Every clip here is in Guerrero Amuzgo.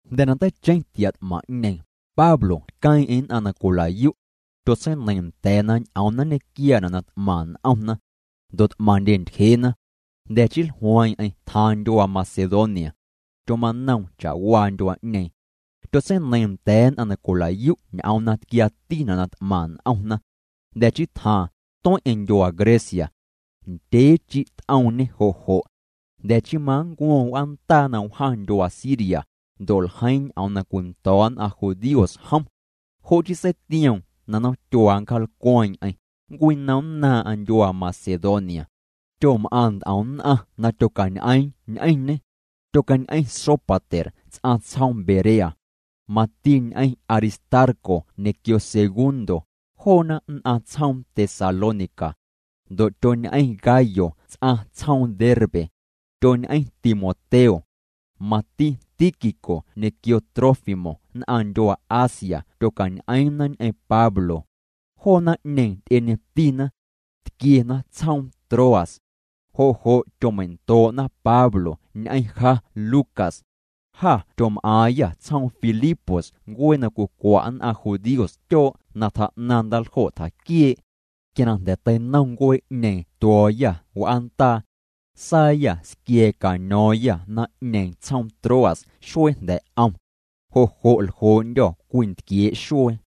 Jnda̱ na teicheⁿ tia' t'maⁿ'ñeeⁿ, Pablo tqueeⁿ'eⁿ nn'aⁿ na cwila'yu'. Tyotseineiiⁿ nda̱a̱na ñ'oom na nñequiaana' na t'maⁿ n'omna. Ndo' t'maⁿndye ntyjeena. Jnda̱ chii jlueeⁿ'eⁿ tjaaⁿ ndyuaa Macedonia. Tyomanoom cha'waa ndyuaa'ñeeⁿ. Tyotseineiiⁿ nda̱a̱ nn'aⁿ na cwila'yu' ñ'oom na tquiaatina' na t'maⁿ n'omna. Jnda̱ chii tjaaⁿ, tueⁿ'eⁿ ndyuaa Grecia. Ndyee chi' t'oomñê jo' jo'. Jnda̱ chii manncuo̱o̱ⁿ w'aandaa na wjaⁿ ndyuaa Siria, ndo' ljeiiⁿ ñ'oom na cwindo̱o̱ nn'aⁿ judíos jom. Jo' chii seitioom na nomtyuaa nncjaalcweeⁿ'eⁿ, nncwinomnnaaⁿ'aⁿ ndyuaa Macedonia. Tyom'aⁿ nt'om nn'aⁿ na tyocañ'eeⁿ ñ'eⁿñê. Tyocañ'eⁿ Sópater ts'aⁿ tsjoom Berea. Mati ñ'eⁿ Aristarco ñequio Segundo, joona nn'aⁿ tsjoom Tesalónica. Ndo' tyoñ'eⁿ Gayo ts'aⁿ tsjoom Derbe. Tyoñ'eⁿ Timoteo. Mati Tíquico ñequio Trófimo nn'aⁿ ndyuaa Asia tyocañ'eeⁿna ñ'eⁿ Pablo. Joo naⁿ'ñeeⁿ ty'eñetina. Tquiena tsjoom Troas. Jo' jo' tyomei'ndoo'na Pablo ñ'eⁿ ja Lucas. Jâ tyom'aaⁿyâ tsjoom Filipos ncuee na cwicwa' nn'aⁿ judíos tyoo' na tjaa'naⁿ ndaaljo' tjaquiee'. Quia na jnda̱ teinom ncuee'ñeeⁿ tuo̱o̱yâ w'aandaa. Saayâ squia̱a̱caño̱o̱ⁿyâ naⁿ'ñeeⁿ tsjoom Troas xuee jnda̱ 'om. Jo' jo' ljoo'ndyô̱ cwii ntquiee' xuee.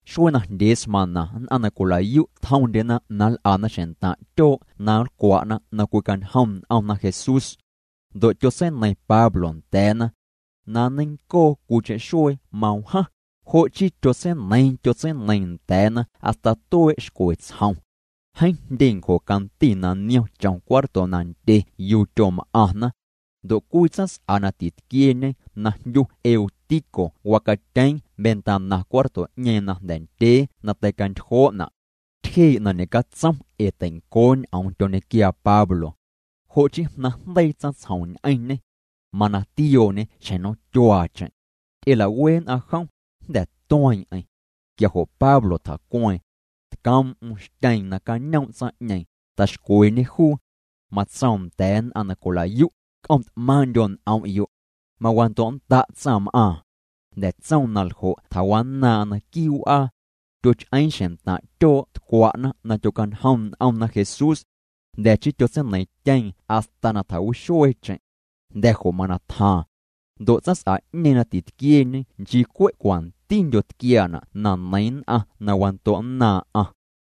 Xuee najndyee smaⁿna, nn'aⁿ na cwila'yu' tjomndyena na nl'ana xeⁿntaⁿ' tyoo' na nlcwa'na na cwicañjom n'omna Jesús. Ndo' tyotseineiⁿ Pablo nda̱a̱na. Na nneiⁿncoo cwiicheⁿ xuee mawjaⁿ, jo' chii tyotseineiiⁿ tyotseineiiⁿ nda̱a̱na hasta tuee' xcwe tsjom. Jeeⁿ jndye ncjocandi na niom chom cuarto nandye yuu tyom'aⁿna. Ndo' cwii tsaⁿs'a na titquieñe na jndyu Eutico wacatyeeⁿ mantana cuarto'ñeeⁿ na jnda̱ ndyee na teicantyjoo'na'. Tyjee' na ñe'catsom ee teincoo ñ'oom tyoñequiaa Pablo. Jo' chii jnaⁿjndeii tsaⁿtsjom ñ'eⁿñê. Mana tiooñê xjeⁿ nomtyuaacheⁿ. Ty'ela'we nn'aⁿ jom, jnda̱ tueeⁿ'eⁿ. Quia jo' Pablo tjacueeⁿ. Tcoom'm xtyeeⁿ nacañoom' tsaⁿ'ñeeⁿ, taxcweeñê juu. Matsoom nda̱a̱ nn'aⁿ na cwila'yu': —C'om't'maaⁿ'ndyo' n'om'yo'. Mawando'nnda' tsaⁿm'aaⁿ. Jnda̱ tsoom na ljo' tjawannaaⁿ'aⁿ naquii' w'aa. Tyoch'eeⁿ xeⁿntaⁿ' tyoo' tcwa'na na tyocañjom n'omna Jesús. Jnda̱ chii tyotseineiⁿtyeeⁿ hasta na tjawixueecheⁿ. Jnda̱ jo' mana tjaaⁿ. Ndo' tsaⁿs'a'ñeeⁿ na titquieñe nchii cwe' cwantindyo tquiaana' na neiiⁿ nn'aⁿ na wando'nnaaⁿ'aⁿ.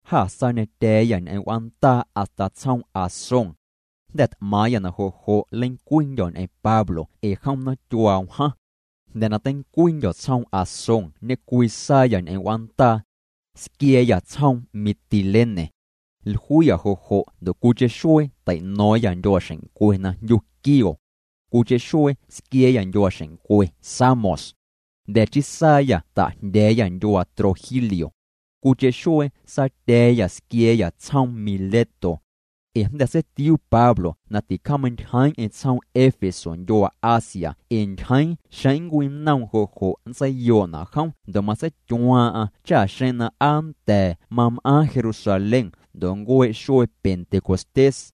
Jâ saañetya̱a̱yâ ñ'eⁿ w'aandaa hasta tsjoom Asón. Jnda̱ t'maaⁿyâ na jo' jo' nleincwindyô̱ ñ'eⁿ Pablo ee jom nomtyuaa wjaⁿ. Jnda̱ na teincwindyô̱ tsjoom Asón ñe'cwi saayâ ñ'eⁿ w'aandaa. Squia̱a̱yâ tsjoom Mitilene. Jluii'â jo' jo' ndo' cwiicheⁿ xuee tei'no̱o̱ⁿyâ ndyuaaxeⁿncwe na jndyu Quío. Cwiicheⁿ xuee squia̱a̱yâ ndyuaaxeⁿncwe Samos. Jnda̱ chii saayâ ta'jndya̱a̱yâ ndyuaa Trogilio. Cwiicheⁿ xuee saatya̱a̱yâ squia̱a̱yâ tsjoom Mileto. Ee jnda̱ seitiuu Pablo na ticjaameintyjeeⁿ'eⁿ tsjoom Éfeso ndyuaa Asia ee ntyjeeⁿ xeⁿ nncwinoom jo' jo' nntseiyoo'na' jom ndo' matseityuaaⁿ'aⁿ cha xeⁿ na aa nnda̱a̱ mam'aaⁿ Jerusalén ndo' nncuee' xuee Pentecostés.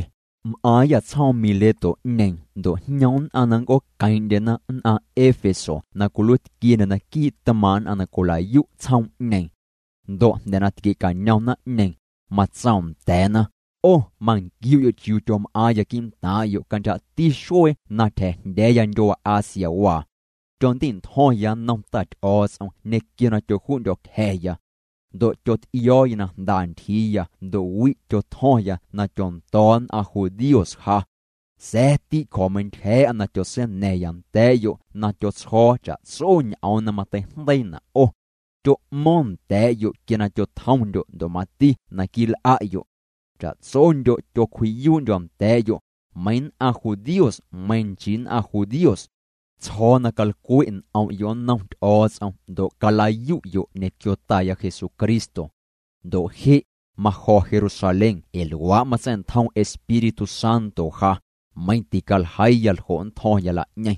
M'aaⁿyâ tsjoom Mileto'ñeeⁿ ndo' jñoom nn'aⁿ na nnc'ooqueeⁿ'ndyena nn'aⁿ Éfeso na cwiluiitquiendye naquii' tmaaⁿ' nn'aⁿ na cwila'yu' tsjoom'ñeeⁿ. Ndo' jnda̱ na tquie'cañom naⁿ'ñeeⁿ, matsoom nda̱a̱na: —'O manquiu'yo' chiuu tyom'aaⁿya quii'ntaaⁿ'yo' cantyjati xuee na tyja̱jndya̱a̱ya ndyuaa Asiawaa. Tyondi'ntjo̱ⁿya nnom Ta Ty'o̱o̱ts'om ñequio na tyoju'ndyo̱cja̱ya. Ndo' tyot'io̱o̱ya na jnda ntyjiiya ndo' wi' tyotjo̱ⁿya na tyondo̱o̱ nn'aⁿ judíos ja. Sa̱a̱ tîcjo̱meintyja̱a̱'a na tyotseina̱ⁿya nda̱a̱'yo' na tyotsjo̱o̱ cha'tso ñ'oom na mateijndeiina' 'o. Tyo'mo̱o̱ⁿ nda̱a̱'yo' quia na tyotjomndyo' ndo' mati naquii' l'a'yo'. Cha'tsondyo' tyocwji'yuu'ndyo̱ nda̱a̱'yo', meiiⁿ nn'aⁿ judíos meiiⁿ nchii nn'aⁿ judíos. Tsjo̱o̱ na calcwe' n'om'yo' nnom Ty'o̱o̱ts'om ndo' cala'yu'yo' ñequio Taya Jesucristo. Ndo' je', majo̱ Jerusalén ee luaa' matsa̱'ntjom Espíritu Santo ja, meiⁿ ticaljeiiya ljo' nntjo̱ⁿya la'ñeⁿ.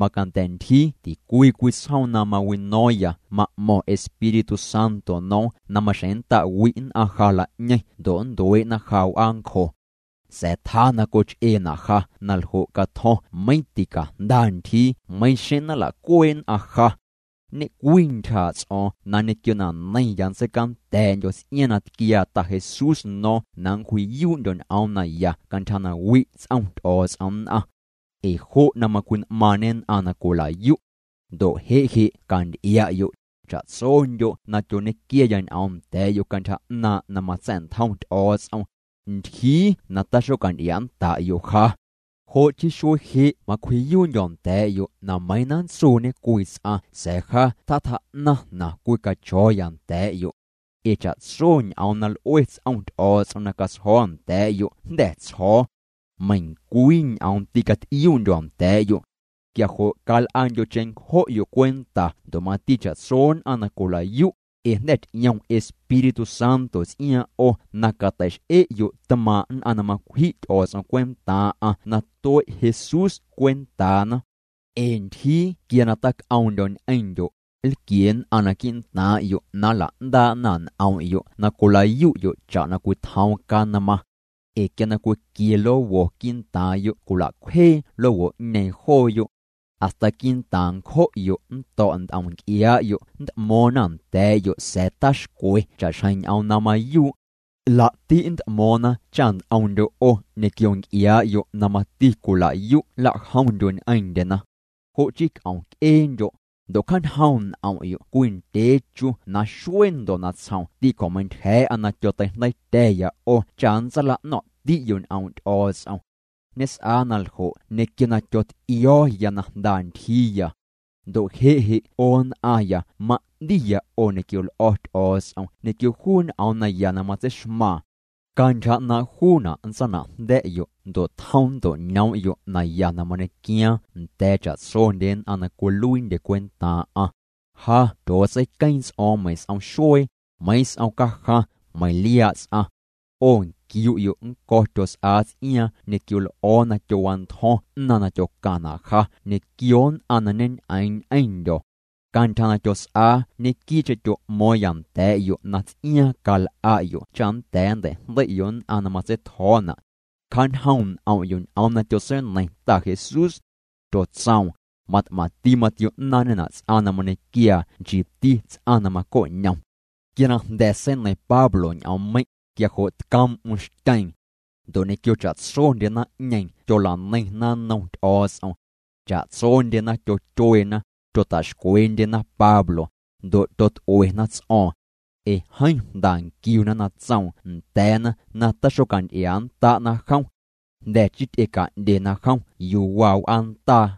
Macanda̱ ntyjii ticwii cwii tsjoom na mawino̱o̱ⁿya ma'mo̱ⁿ Espíritu Santo no̱o̱ⁿ na maxjeⁿ nnta'wi' nn'aⁿ ja la'ñeⁿ ndo' nntuee'na ja w'aancjo. Sa̱a̱ tjaa na coch'eena' ja na ljo' catjo̱ⁿ meiⁿ ticajnda ntyjii meiiⁿ xeⁿ na nlacuee' nn'aⁿ ja. Ñe'cwii ntyjaa' ts'o̱o̱ⁿya na ñequio na neiⁿya nntseicanda̱a̱'ndyo̱ ts'iaaⁿ na tquiaa Ta Jesús no̱o̱ⁿ na nncwji'yuu'ndyo̱ ñ'oom naya cantyja na wi' ts'om Ty'o̱o̱ts'om nn'aⁿ. Ee jo' na macwji'n'maaⁿñê nn'aⁿ na cwila'yu'. ’Ndo' je' je' canty'ia'yo', cha'tsondyo' na tyoñequiaya ñ'oom nda̱a̱'yo' cantyja 'naaⁿ' na matsa̱'ntjom Ty'o̱o̱ts'om, ntyjii na taxocanty'ia'nnda'yo' ja. Jo' chii xuee je' macwji'yuu'ndyo̱ nda̱a̱'yo' na meiiⁿ na nntsuuñe cwii ts'aⁿ sa̱a̱ ja tatjaa'naⁿ jnaⁿ cwii cacho̱o̱ya nda̱a̱'yo'. Ee cha'tso ñ'oom na l'ue ts'om Ty'o̱o̱ts'om na catsjo̱o̱ nda̱a̱'yo' jnda̱ tsjo̱o̱. Meiⁿcwii ñ'oom tîcat'iuu'ndyo̱ nda̱a̱'yo'. Quia jo' cal'a'ndyo'cheⁿncjo'yo' cwenta ndo' mati cha'tso nn'aⁿ na cwila'yu', ee jnda̱ ty'iom Espíritu Santo ts'iaaⁿ 'o na catei'x'e'yo' tmaaⁿ' nn'aⁿ na macwji' Ty'o̱o̱ts'om cwentaaⁿ'aⁿ na tue' Jesús cwentaana. Ee ntyjii quia na tac'o̱o̱ⁿndyo̱ ñ'eⁿndyo', nlquie nn'aⁿ naquii' ntaaⁿ'yo' na nla'ndaa'na n'om'yo' na cwilayu'yo' cha'na cwitjoom canmaⁿ. Ee quia na cwiquie lowo quii'ntaaⁿyo' cwila'cwjee lowo'ñeeⁿ jooyo'. Hasta quii'ntaaⁿ' ncjo'yo' nnto̱' nt'om nc'iaa'yo' nnt'mo̱o̱ⁿna nda̱a̱'yo' sa̱a̱ taxcwe cha'xjeⁿ ñ'oom na mayuu'. Laa'ti' nnt'mo̱o̱ⁿna cha nt'omndyo' 'o ñequio nc'iaa'yo' na mati cwila'yu' nlajomndyo' ñ'eⁿndyena. Jo' chii c'omc'eendyo', ndo' cjaañjoom' n'om'yo' cwii ndyee chu naxuee ndo' natsjom tîcjo̱meintyja̱a̱'a na tyoteijndeitya̱ya 'o cha nntsaala'no̱ⁿ'ti'yo' ñ'oom' Ty'o̱o̱ts'om. Ñes'aa na ljo' ñequio na tyot'io̱o̱ya na jnda ntyjiiya. ’Ndo' je' je' 'o nn'aⁿya ma'ndiya 'o ñequio l'o̱ Ty'o̱o̱ts'om ñequio juu ñ'oom naya na matseixmaaⁿ. Cantyja 'naaⁿ' juuna' nntsaanajnda̱'yo' ndo' tjom nnto'ñoom'yo' naya na mañequiaaⁿ nda̱a̱ cha'tsondye nn'aⁿ na cwiluiindye cwentaaⁿ'aⁿ. Ja tyootseiqueeⁿ ts'o̱o̱ⁿ meiⁿ s'om xuee, meiⁿ s'om cajaⁿ, meiⁿ liaa' ts'aⁿ. 'O nquiu'yo' nnco̱ tyots'aa ts'iaaⁿ ñequio l'o̱o̱ na tyowantyjo̱ⁿ 'naⁿ na tyocaⁿna' ja ñequio nn'aⁿ na ñeñ'eeⁿ ñ'eⁿndyo̱. Cantyja na tyots'aa ñequii'cheⁿ tyo'mo̱o̱ⁿya nda̱a̱'yo' na ts'iaaⁿ cal'a'yo' cha nnda̱a̱ nntei'jndei'yo' nn'aⁿ na matsei'tjo̱o̱na'. Cjaañjoom' n'om'yo' ñ'oom na tyotseineiⁿ Ta Jesús. Tyotsoom: “Mat'maⁿti matio'naaⁿñena' ts'aⁿ na mañequiaa nchiiti ts'aⁿ na maco'ñom.” Quia na jnda̱ seineiⁿ Pablo ñ'oommeiⁿ', quia jo' tcoom'm xtyeeⁿ. Ndo' ñequio cha'tsondye naⁿ'ñeeⁿ tyola'neiⁿna nnom Ty'o̱o̱ts'om. Cha'tsondyena tyotyueena, tyota'xcweendyena Pablo, ndo' tyot'uena ts'o̱o̱ⁿ. Ee jeeⁿ jnda nquiuna na tsoom nda̱a̱na na taxocanty'iaannda'na jom. Jnda̱ chii ty'eca'ndyena jom yuu waa w'aandaa.